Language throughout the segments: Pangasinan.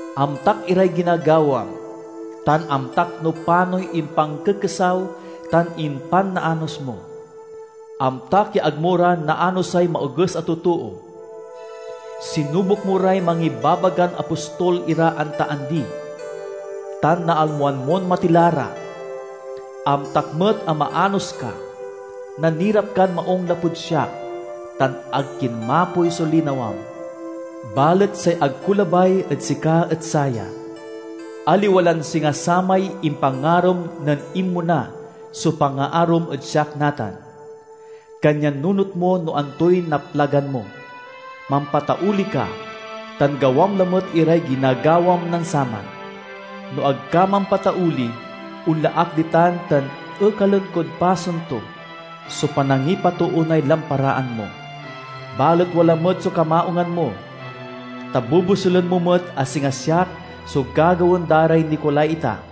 Amtak iray ginagawam; tan amtak no panoy impankekesaw tan impanaanos mo. Amtak ya ag mo ra naanosay maoges a totoo. Sinubok mo ray mangibabagan apostol ira anta andi, tan nalmoan mon matila ra. Amtak met a maanos ka, nanirap kan maung lapud siak, tan ag kinmapoy so linawam. Balet say ag ko labay ed sika et saya: aliwa lan singa samay impangarom nen inmona so pangaarom ed siak natan. Kanyan nunot mo no antoy naplagan mo, mampatauli ka, tan gawam lamet iray ginagawam nen saman. No ag ka mampatauli, onla ak ditan tan ekalen kod pasen to so panangipatoonay lamparaan mo. Balet wala met so kamaungan mo, ta bobosulen mo met a singa siak so gagawaen da ray Nicolaita.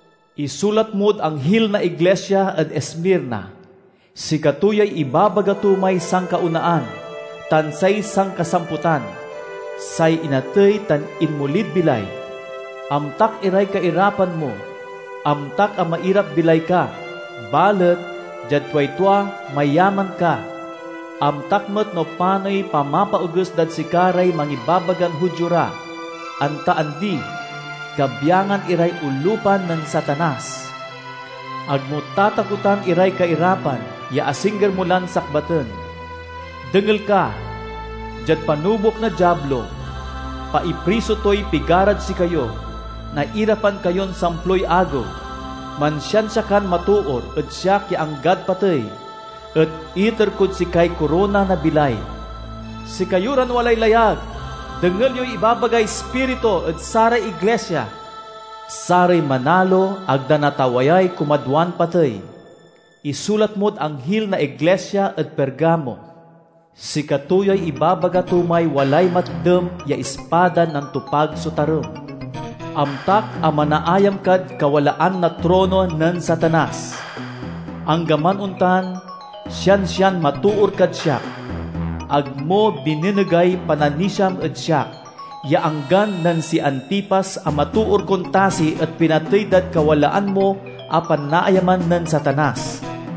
"Isulat mod anghil na iglisia ed Esmirna: "Sikato yay ibabaga to may sankaonaan tan say sankasamputan, say inatey tan inmolid bilay. Amtak iray kairapan mo; amtak a mairap-bilay ka balet, diad tuay tua, mayaman ka! Amtak met no panoy pamapaoges dad sika ray mangibabagan Judio ra, anta andi; kabyangan iray olupan nen Satanas! Ag mo tatakotan iray kairapan ya asingger mo lan sakbaten. Dengel ka! Diad panubok na Diablo, paipriso toy pigarad sikayo; nairapan kayon samploy agew. Mansiansia kan matoor ed siak ya anggad patey, et iter kod sikay korona na bilay. "Sikayo ran walay layag, dengel yoy ibabagay Ispiritu ed saray iglisia! "Saray manalo ag da natawayay kumadwan patey. "Isulat mod anghil na iglisia ed Pergamo: "Sikato yay ibabaga to may walay matdem ya ispadan nantopag so tarem. Amtak a manaayam kad kawalaan na trono nen Satanas. Anggaman ontan, siansian matoor kad siak. Ag mo binenegay pananisiam ed siak ya anggan nen si Antipas a matoor kon tasi et pinatey dad kawalaan mo a panaayaman nen Satanas.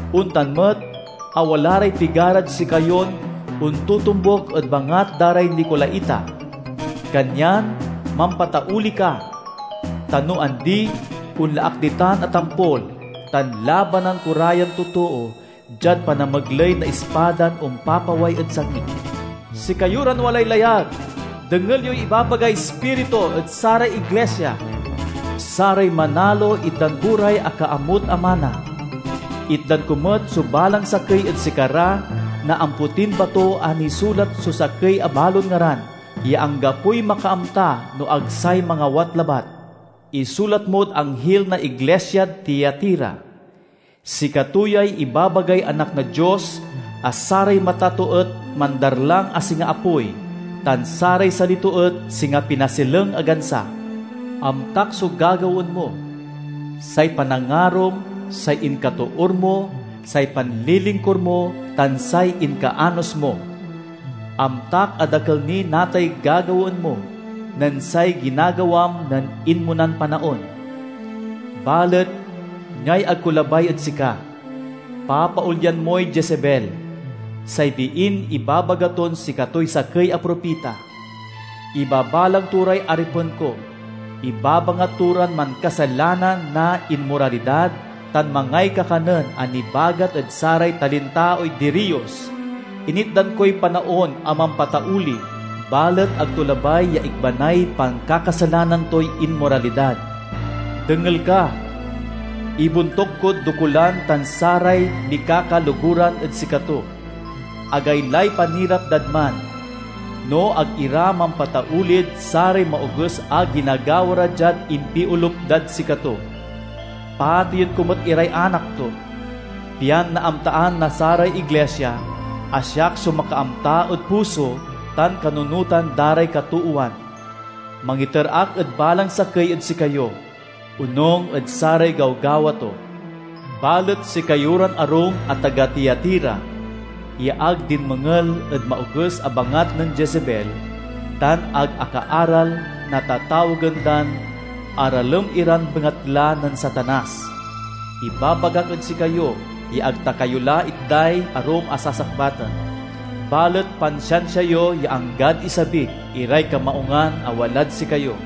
Ontan met a wala ray pigarad sikayon ontotombuk ed bangat da ray Nicolaita. Kanyan mampatauli ka! Ta no andi, onla ak ditan a tampol, tan labanan ko ra yan totoo diad panamegley na ispadan ompapaway ed sangik. "Sikayo ran walay layag, dengel yoy ibabagay Ispiritu ed saray iglisia! "Saray manalo itdan ko ray akaamut a mana. Itdan ko met so balang sakey ed sikara na ampotin bato a nisulat so sakey a balon ngaran, ya anggapoy makaamta no ag say mangawat labat. "Isulat mod anghil na iglisiad Tiatira: "Sikato yay ibabagay Anak na Dios a saray mata to et mandarlang a singa apoy, tan saray sali to et singa pinasileng a gansa. Amtak so gagawaen mo, say panangarom, say inkatoor mo, say panlilingkur mo, tan say inkaanos mo. Amtak a dakel ni natay gagawaen mo nen say ginagawam nen inmonan panaon. Balet niay ag ko labay ed sika: papaolyan moy Jezebel, say biin ibabaga ton sikatoy sakey a propita. Ibabalang to ray aripen ko, ibabangat to ran mankasalanan na inmoralidad tan mangay kakanen a nibagat ed saray talintaoy diriyos. Initdan koy panaon a mampatauli, balet ag to labay ya ikbanay pankakasalanan toy inmoralidad. Dengel ka! Ibontuk kod dokulan tan saray mikakaloguran ed sikato. Agaylay panirap dad man, no ag ira mampataulid saray maoges a ginagawa ra diad impiolup dad sikato. Pateyen ko met iray anak to, pian naamtaan na saray iglisia a siak so makaamta ed puso tan kanunotan da ray katoowan. Mangiter ak ed balang sakey ed sikayo, onung ed saray gawgawa to. "Balet sikayo ran arum a taga Tiatira, ya ag dinmengel ed maoges a bangat nen Jezebel tan ag akaaral na tatawagen dan 'aralem iran bengatla nen Satanas,' ibabagak ed sikayo ya ag ta kayo la itday arum a sasakbaten. Balet pansiansia yo ya anggad isabik iray kamaungan a walad sikayo.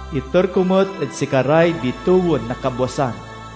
Iter ko met ed sikaray bitewen na kabwasan.